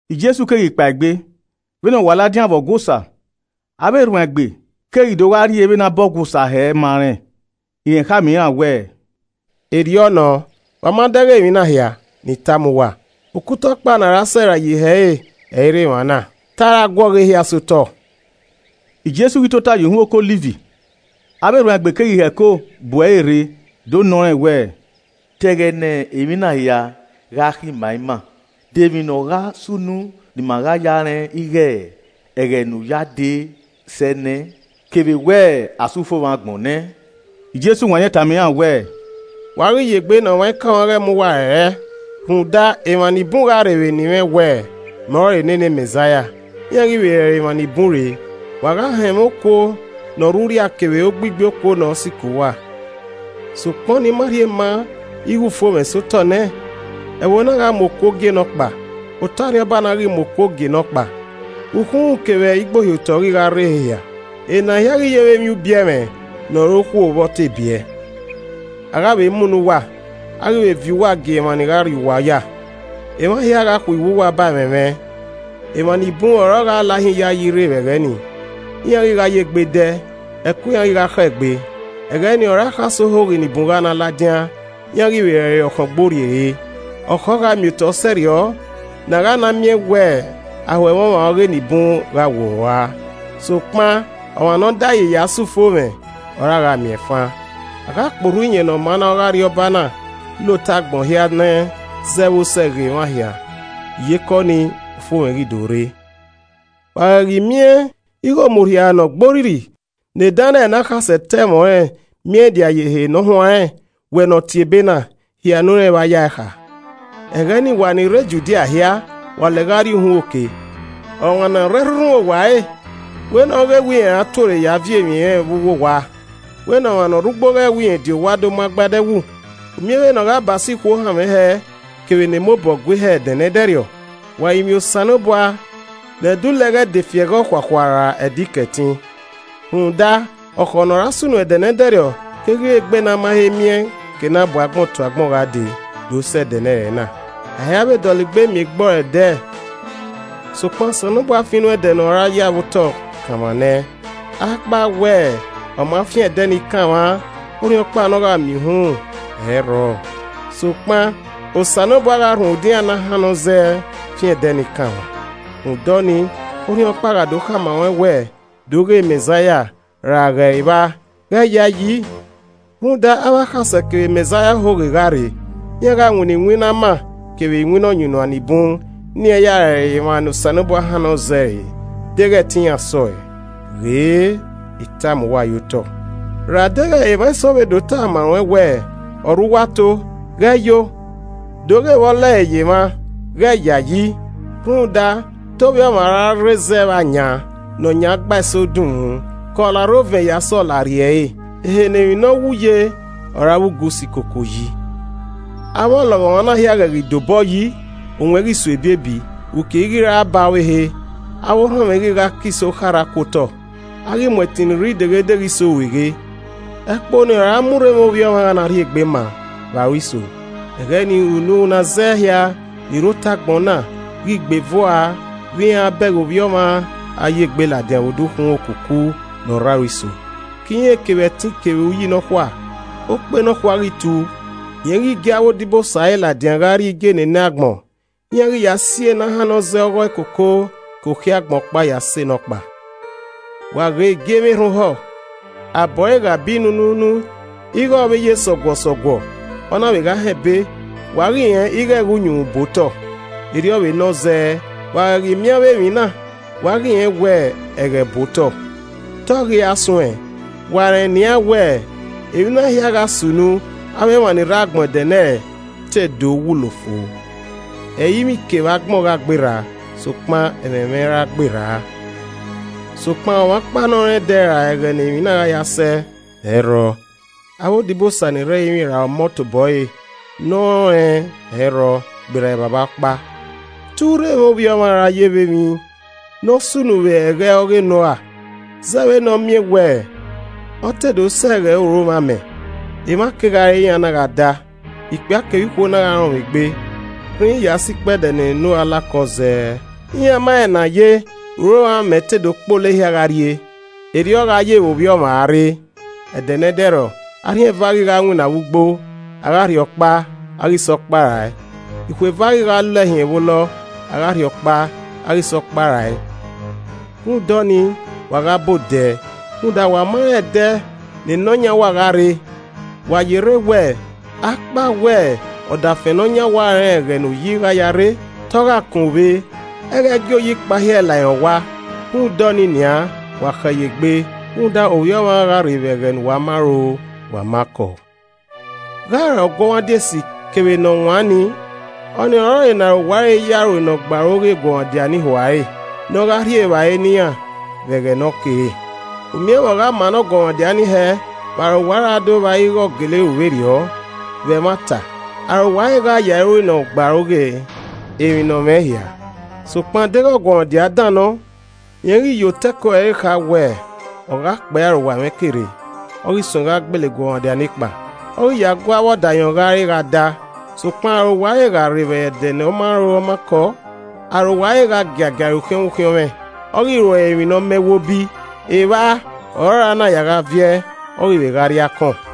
Jesu keghi kpaegbe, vbene ọ wa ladian vbe Ọgua Osa, avbe erhuanegbe keghi do gha rhie vbene a bọ Ọgua Osa hẹ ma rẹn. Rẹn khama iran wẹẹ, “Erriọ nọ, wa ma dẹghe emwi na hia, ne I tama uwa, okuta ọkpa ne a ra sẹrae ye ihe ẹre, ẹ i rre emwa na, te a ra guọghọ ehia sẹ otọ.” Jesu ghi tota ye uhunmwu oke Ọliv, avbe erhuanegbe keghi hẹko bu ẹre rre do nọ rẹn wẹẹ, “Ta ẹghẹ ne emwi na hia gha khin ma ima, de emwi ne ọ gha sunu ni ima gha ya rẹn ighe ẹghẹ ne u ya dee sẹ ne, kevbe wẹẹ a sẹ ufomwẹ agbọn nẹ?” Jesu wanniẹn tama iran wẹẹ, “Wa ghi yegbe ne ọmwaikọmwa ghẹ mu uwa rẹrẹ. Rhunmwuda, emwa ni bun gha rre vbe eni mwẹ wẹẹ, ‘Mẹ ọrọre nene Mẹzaia,’ iran ghi vbe rẹrẹ emwa ni bun re. Wa gha họn ẹmwẹ okuo ne ọ rre urria kevbe ogbigbi okuo ne ọ sikẹ uwa, sokpan ọnii ma rhie ma ighe ufomwẹ sẹ otọ nẹ. Ẹvbo na gha mu okuo gie nọkpa, otọ arriọba na ghi mu okuo gie nọkpa. Ukhumwu kevbe igbohiotọ ghi gha rre ehe hia. Ena hia keghi yevbe emwi ubiẹmwẹ ne ọ ru okhuo vbe ọ te biẹ. “A gha vbe munọ uwa, a ghi vbe viọ uwa gie emwa ni gha rri uwa oya. Emwa hia ghi gha khuiwu uwa ba ẹmwẹ mwẹ. Emwa ni bun ọre ọ gha lahin iyayi rre vbe ẹghẹ ni. Iran ghi gha ye egbe dẹ, ẹko iran ghi gha khọ egbe. Ẹghẹ ni ọre akhasẹ ohoghe ni bun gha na ladian, iran ghi vbe rẹrẹ ọkhọngborrie re. Ọkhọ gha miotọ sẹrriọ ne a gha na miẹn wẹẹ aho ẹmwẹ ọmwa eni bun gha worua. Sokpan ọmwa ne ọ da ẹe yi ya sẹ ufomwẹ, ọre a gha miẹn fan. A gha kporhu Iyẹn Ne ọ maa ọghe Arriọba na la otọ agbọn hia nẹ zẹ vbe osẹe ghe emwa hia, iyeke ọnii, ufomwẹ ghi do rre. “Wa ghẹ ghi miẹn ighe Omurhia Ne ọ gbe orrirri ne Daniẹl ne akhasẹ ta ẹmwẹ ọnrẹn miẹn dia ye ehe ne ọ huanrẹn.” (Wẹ ne ọ tie ebe na, hia ne u rẹn evba yae kha.) “Ẹghẹ ni wa ni rre Judia hia, wa lẹ gha rrie uhunmwu oke. Ọmwa ne ọ rre ẹrhunrhun owa ẹre, wẹ ne ọ ghẹ wẹ rẹn ra tuorre ya viọ emwi ẹnrẹn vbe uwu owa. We ne ọmwa ne orre ugbo ghẹ wẹ rẹn die owa do mu agbada ẹwu. U miẹn vbene ogha ba so ikhuo-hanmwẹ kevbe ne emobọ gue hẹ ẹdẹnẹdẹrriọ. Wa rinmwian Osanobua, ne ẹdẹ ulẹ ghẹ i de fi ẹghẹ okhuakhua ra Ẹdẹ Ikẹtin. Rhunmwuda ọkhọ ne ọ ra sunu ẹdẹnẹdẹrriọ keghi re egbe ne a ma he miẹn ke ne abuagbọn tuagbọn gha dee do sẹ ẹdẹnẹrẹ na. A i ra vbe dọlegbe miẹn egbe ọre ẹdẹ. Sokpan Osanobua fian inu ẹdẹ ne ọ ra ya vbe otọ kanmwa nẹ. Akpawẹ ọ ma fian ẹdẹ ni kanmwa, orhiọnkpa ne ọ gha miẹn uhunmwu, ẹ i rrọọ. Sokpan Osanobua gha rhunmwuda iran ne ọ hannnọ zẹ fian ẹdẹ ni kanmwa. “Rhunmwuda ọnii, orhiọnkpa gha do khama ruẹn wẹẹ, ‘Do ghe Mẹzaia!’ ra ‘Ghe ẹre vba,’ ghẹ ya ẹe yi. Rhunmwuda, avbe akhasẹ kevbe Mẹzaia ohoghe gha rre. Iran gha winna iwinna ama kevbe iwinna ọyunnuan ni bun ne iran ya rẹrẹ emwa ne Osanobua hannọ zẹ re deghẹ ẹtin iran sọe. Ghe I tama uwa yotọ nẹ. “Ra deghẹ emwa eso vbe do tama ruẹn wẹẹ, ‘Ọ rre uwa ato,’ ghẹ yo ‘Do ghe vbe ọ lẹre ye emwa’ ghẹ yayi. Rhunmwuda te Ovbi Ọmwa ra rre vbe ayan ne ọ yan gbe iso dunmwu ke ọlarre ovẹn ya sẹ ọlarrie ẹre. Ehe ne emwi nọwu ye, ọre avbe ugu si koko yi. “Avbe ọlọghọmwa na hia ghẹ ghi da obọ yi, owẹn ghi so ebiebi, uki i ghi ra ba ọvbehe, avbe orhọnmwẹ ghi gha ke iso kharha ku otọ, a ghi mu ẹtin ni re ideghedeghe iso rueghe. Ẹkpo ni ọre ama urremwẹ Ovbi Ọmwa gha na rhiegbe ma, vbe aro iso. Ẹghẹ ni, unu ne a zẹ hia ni rre otọ agbọn na, ghi gbe eve ua vbe iran a bẹghe vbe Ovbi Ọmwa a ya egbe ladian vbe odukhunmwu okuku ne ọ rre aro iso, ke irẹn kevbe ẹtin kevbe Uyi nọkhua. Okpe nọkhua ghi tu, rẹn ghi gie avbe odibosa ẹre ladian gha rrie igie enenẹ agbọn. Iran ghi ya si e na hannọ zẹ ọghọe koko ke okhiẹ agbọn ọkpa ya sẹ nọkpa. “Wa ghe igiemwi erhan ohọ. Abọ ẹre gha bi nunuunu ighe ọ vbe ye sọguọsọguọ, ọ na vbe gha họn ebe, wa ghi rẹn ighe ẹghẹ uyunmwu bu otọ. Erriọ vbe nọ zẹ, wa ghẹ ghi miẹn avbe emwi na, wa ghi rẹn wẹ ẹghẹ bu otọ, te ọ ghi ra suẹn. Wa rẹn nian wẹ, emwi na hia gha sunu avbe emwa ni rre agbọn ẹdẹnẹrẹ te do wulo fo. Ẹrinmwi kevbe agbọn gha gberra, sokpan, ẹmwẹ mwẹ i ra gberra. “Sokpan, ọmwa ọkpa ne ọ rẹn ẹdẹ ra ẹghẹ ne emwi na gha ya sẹ, ẹ i rrọọ, avbe odibosa ni rre ẹrinmwi, ra Ọmọ tobọ ẹre, ne ọ rẹn ọnrẹn, ẹ i rrọọ, gberra Evbavba Ọkpa. Te urremwẹ Ovbi Ọmwa ra ye vbe emwi ne ọ sunu vbe ẹghẹ ọghe Noa. Zẹẹ vbe ne a miẹn wẹẹ, ọ te do sẹ ẹghẹ uromwẹ amẹ, emwa kegha re, iran na gha da, ikpia kevbe ikhuo na gha rọnmwẹ egbe, rhinrin ya sẹ ikpẹdẹ ne Noa la okọ zẹẹ. Iran ma rẹn enaye uromwẹ amẹ te do kpolo ehia gha rrie. Erriọ ọ gha ye vbe Ovbi Ọmwa a rre. Ẹdẹ ne ẹdẹrriọ, arhin eva ghi gha winna vbe ugbo, a gha rhie ọkpa, a ghi sẹ nọkpa rae. Ikhuo eva ghi gha lọ ẹhiẹn vbe olọ, a gha rhie ọkpa, a ghi sẹ nọkpa rae. Rhunmwuda ọnii, wa gha ba odẹ rhunmwuda wa ma rẹn ẹdẹ ne Nọyan uwa gha rre. Wa yerre wẹẹ, akpawẹ ọdafẹn ne ọ yan owa rẹn ẹghẹ ne oyi gha ya rre, te ọ gha kọnvbe, ẹ i ghẹ gie oyi kpahiẹ la irẹn owa. Rhunmwuda ọnii nian, wa khẹ ye egbe rhunmwuda Ovbi Ọmwa gha rre vbe ẹghẹ ne uwa ma ro wa ma kọọ. “Gha ọre ọguọmwadia esi kevbe ne ọ wan nii, ọnii ọrọre ne arowa ẹre ya ru ne ọ gbe aro ghe eguọmwadia ne ihua ẹre ne ọ gha rhie evbare ne iran vbe ẹghẹ ne ọkere. U miẹn vbe ọ gha ma ne ọguọmwadia ni hẹẹ vbe arowa ẹre a do vba ighe ọ gele ru vberriọ! Vbe ẹmwata, arowa ẹre gha ya ẹe ru ne ọ gbe aro ghe emwi ne ọ mwẹ hia. Sokpan, deghẹ ọguọmwadia dan nọ, rẹn ghi ye otọ ẹko ẹre kha wẹẹ, ‘Ọ gha kpee arowa mwẹ ke rre.’ Ọ ghi suẹn gha gbele eguọmwadia nekpa, ọ ghi ya gu avbe Ọdayọn gha re gha da. Sokpan arowa ẹre gha rre vbe ẹdẹ ne ọ ma ro ọ ma kọọ. Arowa ẹre gha giagia ẹre ukhiọnmwẹ ukhiọnmwẹ, ọ ghi ru ẹre emwi ne ọ ma ẹwobi. Evba ọ ra na ya gha viẹ, ọ ghi vbe gha rri akọn.